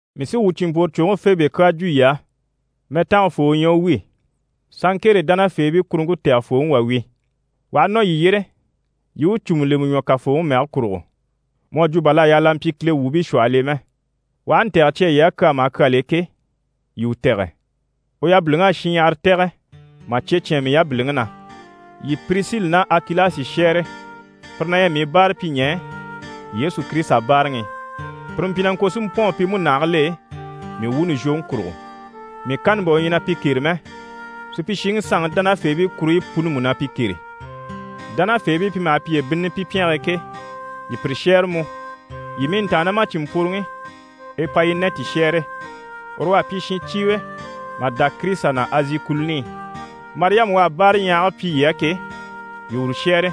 Mii sí wuu cìnmpworocwoŋi Febe kyaa jwo yii á, mɛtangafoo u ɲyɛ u wi, Sanŋkere dánafeebii kuruŋke tɛgɛfooŋi wà wi. U aha nɔ yii yyére, yii i u cùmu lemɛ ɲwɔ Kafooŋi mɛge kurugo, mu à jwo bà l'à yaa l'a mpyi Kile wuubii shwɔhɔl'e mɛ. U aha ntɛ̀gɛ cya yii á kyaa maha kyal'e ke, yii u tɛ̀gɛ. U yabiliŋ'à shinɲyahara tɛ̀gɛ mà cye cyán mii yabiliŋi na. Yii Pirisili ná Akilasi shɛ́ɛre. Pire na ɲyɛ mii báarapyiɲɛɛ Yesu Kirisita báaraŋi i. Pire mpyi na ŋko si mpɔ̂ɔn pi múnahigil'e mii wuuni zhwoŋi kurugo. Mii kanni bà u ɲyɛ na pi kêre mɛ, supyishiŋi sanŋi dánafeebii kuruɲyi puni mú na pi kêre. Dánafeebii pi maha piye bínnini pi pyɛnge e ke, yii pire shɛ́ɛre mú. Yii mii ntàannamacinmpworoŋi Epayinɛti shɛ́ɛre. Uru u à pyi shincyiiŋi mà dá Kirisita na Azi kùluni i. Mariyama u à báaraɲyahage pyi yii á ke, yii uru shɛ́ɛre.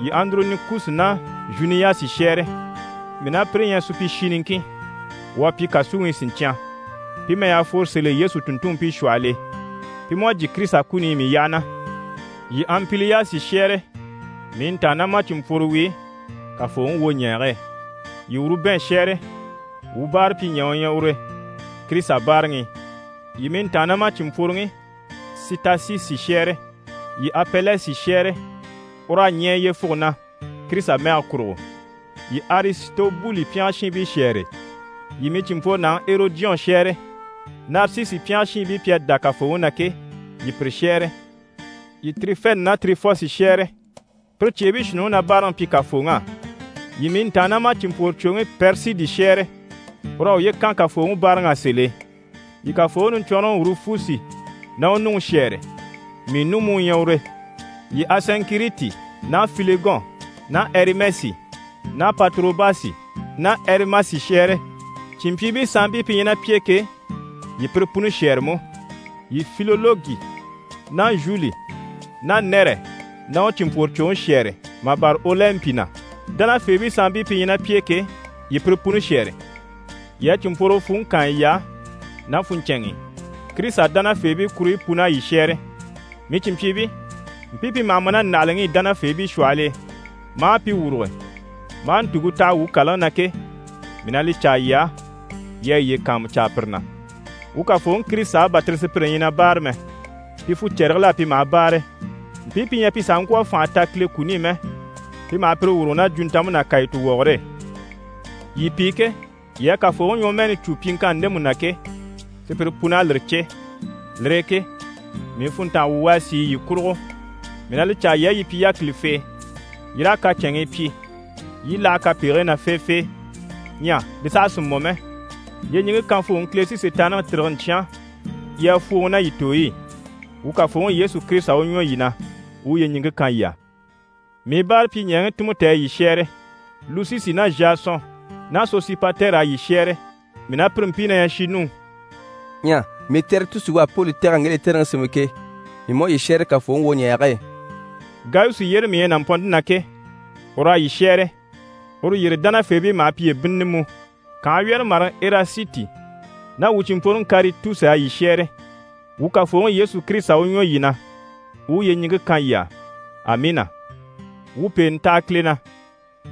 Yii Andoronikusi ná Zhuniyasi shɛ́ɛre. Mii ná pire ɲyɛ supyishi niŋkin, wuu à pyi kàsuŋi i siɲcyan. Pi mɛy'à fworo sèl'e Yesu tùnntunmpii shwɔhɔl'e, pi mú à jyè Kirisita kuni i mii yyaha na. Yii Anpiliyasi shɛ́ɛre, mii ntàannamacinmpworo wi Kafooŋi wwoɲɛɛge e. Yii Urubɛn shɛ́ɛre, wuu báarapyiɲɛɛ u ɲyɛ ure Kirisita báaraŋi i, yii i mii ntàannamacinmpworoŋi Sitasisi shɛ́ɛre. Yii Apɛlɛsi shɛ́ɛre, ur'à ɲɛɛ yyefuge na Kirisita mɛge kurugo. Yii Arisitobuli pyɛngɛ shiinbii shɛ́ɛre. Yii mii cìnmpworonaŋi Erɔdiyɔn shɛ́ɛre. Narisisi pyɛngɛ shiinbii pi à dá Kafooŋi na ke, yii pire shɛ́ɛre. Yii Tirifɛni ná Tirifosi shɛ́ɛre, pire cyeebii shuunniŋi na báaraŋi pyi Kafooŋi á. Yii mii ntàannamacinmpworocwoŋi Pɛrisidi shɛ́ɛre, ur'à uye kan Kafooŋi báaraŋ'á sèl'e. Yii Kafooŋi niɲcwɔnrɔŋi Urufusi ná u nuŋi shɛ́ɛre, mii nu mú u ɲyɛ ure. Yii Asɛnkiriti ná Filegɔn ná Ɛrimɛsi ná Patorobasi ná Ɛrimasi shɛ́ɛre, cìnmpyiibii sanmpii pi ɲyɛ ná pi e ke, yii pire puni shɛ́ɛre mú. Yii Filologi ná Zhuli ná Nɛrɛ ná u cìnmpworocwoŋi shɛ́ɛre mà bâra Olɛnpi na. Dánafeebii sanmpii pi ɲyɛ ná pi e ke, yii pire puni shɛ́ɛre. Yii a cìnmpworogo fwùŋi kaan yiy'á ná funɲcɛnŋi i, Kirisita dánafeebii kuruɲyi pun'à yii shɛ́ɛre. Mii cìnmpyiibii, mpii pi maha ma ná ndàhalaŋi i dánafeebii shwɔhɔl'e, maa pi wuruge, maa ntùŋke taha wuu kàlaŋi na ke, mii na li caa yii á, yii a yiye kàanmucaa pire na. Wuu Kafooŋi Kirisita á bà tire sùpyire ɲyɛ na báare mɛ, pi fucɛrigil'á pi maha báare. Mpii pi ɲyɛ pi sàha ŋkwɔ̀ a fànha ta Kile kuni i mɛ, pi maha pire wuruge ná jwuntanmpe ná kàyituwɔgɔre e. Yii pi ke, yii à Kafooŋi ɲwɔmɛɛni cû pyiŋkanni ndemu na ke, sùpyire pun'à lire cè. Lire e ke mii funntanga wuŋi u à sìi yii kurugo. Mii na li caa yii á, yii pyi yákilifee, yii raa kacɛnŋii pyi, yii i láha kapegigii na feefee. Ɲyɛ li saha sì mɔ mɛ, yyeɲiŋke kanvooŋi Kile sí Sitaanniŋi tîrige n‑cyán yii a fwòoŋi ná yii tooy'e. Wuu Kafooŋi Yesu Kirisita u ɲwɔ yii na, u u yyeɲiŋke kan yii á. Mii báarapyiɲɛɛŋi Timɔti à yii shɛ́ɛre. Lusisi ná Zhasɔn ná Sosipatɛri à yii shɛ́ɛre, mii ná pire mpii na ɲyɛ shinnuu. Ɲyɛ mii Tɛritusi u à Poli tɛ̀g'a ŋge lɛtɛrɛŋi sémɛ ke, mii mú à yii shɛ́ɛre Kafooŋi wwoɲɛɛge e. Gayusi yyére mii ɲyɛ nàmpɔnnte na ke, ur'à yii shɛ́ɛre. Uru yyére dánafeebii maha piye bínnini mú. Kànhe wyɛ́rɛmaraŋi Erasiti ná wuu cìnmpworoŋi Karitusi à yii shɛ́ɛre. [ Wuu Kafooŋi Yesu Kirisita u ɲwɔ yii na, u u yyeɲiŋke kan yii á. Amiina.] Wuu pèenɛ taha Kile na.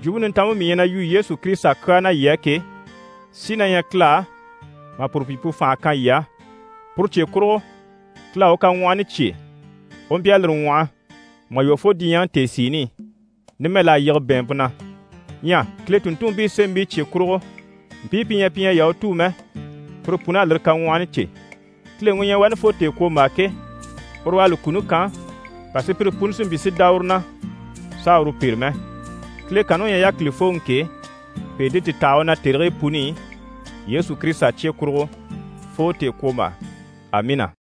Jwumpe Nintanmpe mii ɲyɛ na yu Yesu Kirisita kyaa na yii á ke, sí na ɲyɛ Kile á mà puru pyi pu fànha kan yii á. Puru cye kurugo, Kile à u kaŋwɔhɔni cyêe, u mpyi a lire ŋwɔhɔ mà lwɔ́ fo diɲyɛŋi tèesiini i. Numɛ, l'à yige bɛ̀ɛnmpe na. Ɲyɛ Kile tùnntunmpii sémɛbii cye kurugo, mpii pi ɲyɛ pi ɲyɛ Yahutuu mɛ, pire pun'à lire kaŋwɔhɔni cè. Kileŋi u ɲyɛ wani fo tèekwombaa ke, uru u à li kuni kan, bà sùpyire puni si mpyi si dá uru na s'a uru pêre mɛ. Kile kanni u ɲyɛ yákilifooŋi ke, pèente ti taha u na tèrigii puni i Yesu Kirisita cye kurugo fo tèekwombaa. Amiina.